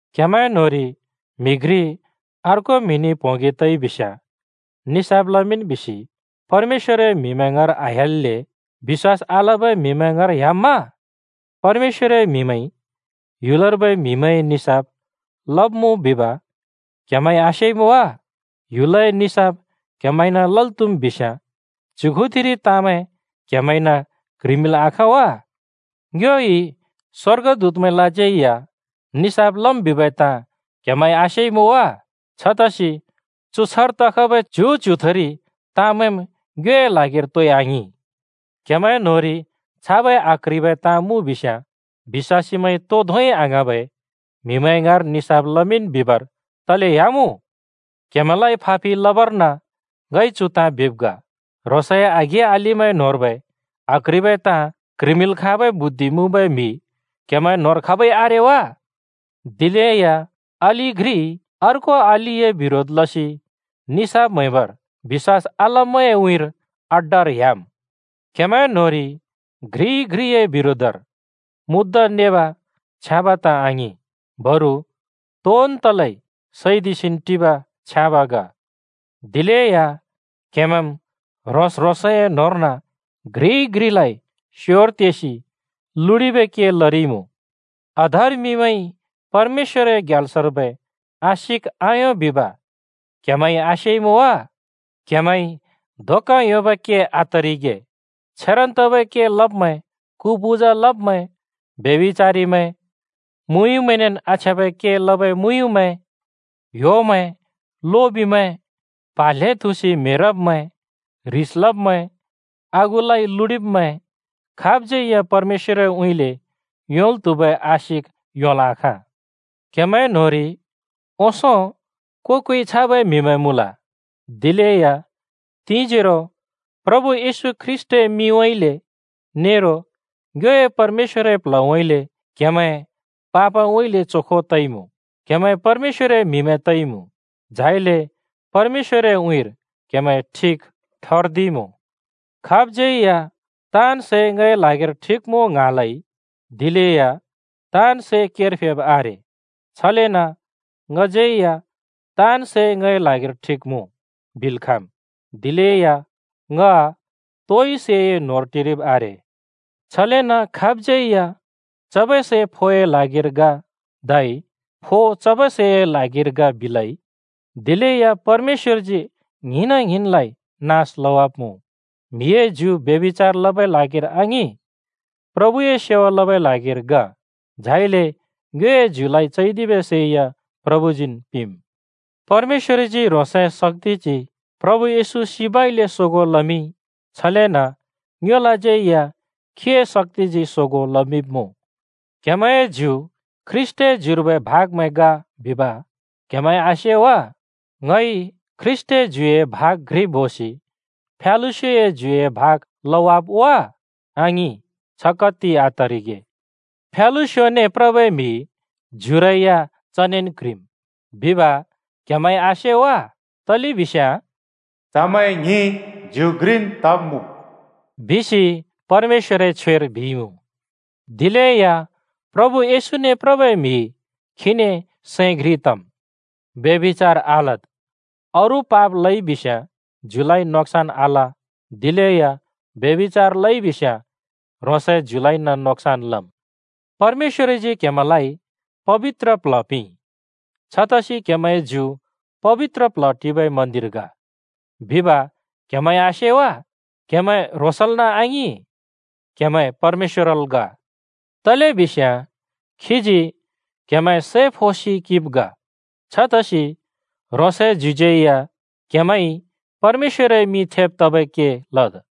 क्‍हेमैं न्‍होंरि म्हि घ्रि अर्को म्हिने प्होंगि तइ बिस्‍याँ निसाफ लमिंन् बिसि परमेश्‍वरए म्‍हिमैं ङाँर आह्‍याल्‍ले? बिश्‍वास आलबै म्हिमैं ङाँर ह्‍याम्मा? परमेश्‍वरए म्‍हिमैंइ ह्‍युलर्बै म्‍हिमैंए निसाफ लब्‍मुँ बिब क्‍हेमैंइ आसेइमुँ वा? ह्‍युलए निसाफ क्‍हेमैंना लल् त्‍हुम् बिस्‍याँ, च्‍युथिरि ताँमैं क्‍हेमैंना क्‍ह्रिमिंल् आखाँ वा? ङ्योइ स्‍वर्गदूतमैंलाज्यै या निसाफ लम् बिबै ताँ क्‍हेमैंइ आसेइमुँ वा? छतसि चु छ्हर तखबै च्यु-च्युथुरि ताँमैंम् ङ्योए ल्हागिर तोइ आङिं। क्हेमैंए न्होंरि छाबै आक्ह्रिबै ताँ मुँ बिस्याँ, बिश्‍वासीमैंइ तो धोंइ आङ्हाँबै म्हिमैं ङाँर निसाफ लमिंन् बिबर तले ह्‍यामुँ? क्‍हेमैंलाइ फापिल् लबर्न ङइ चु ताँ बिब् ग: ह्रोंसए आघें-अलिमैं न्होंर्बै आक्ह्रिबै ताँ क्‍ह्रिमिंल् खाँबै बुद्धि मुँबै म्‍हि क्हेमैं न्होंर खाबै आरे वा? दिलेया अलि घ्रिइ अर्को अलिए बिरोध लसि निसाफ म्हैबर बिश्‍वास आल्ब्मैंए उँइँर अड्डार ह्‍याम्। क्‍हेमैं न्‍होंरि घ्रिइ घ्रिए बिरोधर मुद्दा नेब छ्याँब ताँ आङिं। बरु तोन् तलै सैदिसिन् टिब छ्याँब ग। दिलेया क्हेमैंम् ह्रों-ह्रोंसए न्होंर्न घ्रि‍इ घ्रिलाइ स्योर तेसि लुडिबै के लरिमुँ। अधर्मिमैंइ परमेश्‍वरए ग्याल्सर्बै आशिक आयों बिब क्‍हेमैं आसेइमुँ वा? क्‍हेमैंइ धोका योंबै के आतरिगे। छेरन् तबै के लब्‍मैं, कु पूजा लब्मैं, ब्यभिचारिमैं, मुयुँमैंनेन् आछ्याँबै के लबै मुयुँमैं, ह्‍योमैं, लोबिमैं, प्हा ल्हें थुँसि म्हेरब्‍मैं, ह्रिस लब्‍मैं, आगुलाइ लुडिब्मैं, खाबज्‍यै या परमेश्‍वरउँइँले योंल् त्‍हुबै आशिक योंल् आखाँ। क्‍हेमैं न्‍होंरि ओंसों को-कोइ छाबै म्हिमैं मुँल, दिलेया तिंजोरो प्रभु येशू ख्रीष्‍टए मिंउँइँले नेरो ङ्योए परमेश्‍वरए प्ल्हउँइँले क्‍हेमैं पापउँइँले चोखो तइमुँ, क्‍हेमैं परमेश्‍वरए म्‍हिमैं तइमुँ, झाइले परमेश्‍वरए उँइँर क्‍हेमैं ठिक ठर्दिइमुँ। खाबज्‍यै या “ताँन् सै ङए ल्हागिर ठिक मुँ” ङ्हाँलै, दिलेया ताँन् सै केर फेब् आरे। छलेन ङज्यै या “ताँन् सै ङए ल्हागिर ठिक मुँ” बिल् खाँम्, दिलेया ङ तोइ सैए न्होंर टिरिब् आरे। छलेन खाबज्‍यै या “चबै सै फोए ल्हागिर ग, धै फो चबै सैए ल्हागिर ग,” बिलै। दिलेया परमेश्‍वरजी ङ्हिंना ङ्हिंनलाइ नास लवाब्‍मुँ। म्‍हिए ज्यु ब्यभिचार लबै ल्हागिर आङिं, प्रभुए सेवा लबै ल्हागिर ग, झाइले ङ्योए ज्युलाइ चैदिबै सै या प्रभुजीन् पिंम्। परमेश्‍वरजी ह्रोंसए शक्‍तिजी प्रभु येशू सिबउँइँले सोगों लमिंइ। छलेन ङ्योलाज्यै या खीए शक्‍तिजी सोगों लमिंब्‍मुँ। क्‍हेमैंए ज्यु ख्रीष्‍टए ज्युर्बै भागमैं ग बिब क्‍हेमैंइ आसे वा? ङइ ख्रीष्‍टए ज्युए भाग घ्रि बोसि फ्यालुस्योए ज्युए भाग लवाब् वा? आङिं, छ कत्ति आतरिगे! फ्यालुस्योने प्रबै म्हि ज्युरै या चनेन् क्ह्रिम् बिब क्‍हेमैंइ आसे वा? तलेबिस्याँ “चमैं ङ्हिं ज्यु घ्रिन् तब्‍मुँ।” बिसि परमेश्‍वरए छ्वेर बिइमुँ। दिलेया प्रभु येशूने प्रबै म्हि खीने सैं घ्रि तम्। ब्यभिचार आलद्। अरू पाप लइ बिस्याँ ज्युलाइ नोक्सन् आल, दिलेया ब्यभिचार लइबिस्‍याँ ह्रोंसए ज्युलाइन नोक्सन् लम्। परमेश्‍वरजी क्हेमैंलाइ पबित्र प्ल्ह पिंइ, छतसि क्हेमैंए ज्यु पबित्र प्ल्ह टिबै मन्‍दिर ग बिब क्‍हेमैंइ आसे वा? क्‍हेमैं ह्रोंसल्न आङिं, क्‍हेमैं परमेश्‍वरल् ग। तलेबिस्याँ खीजी क्‍हेमैं सै फोसि किंब् ग। छतसि ह्रोंसए ज्युज्यै या क्हेमैंइ परमेश्‍वरए मिं थेब् तबै के लद्।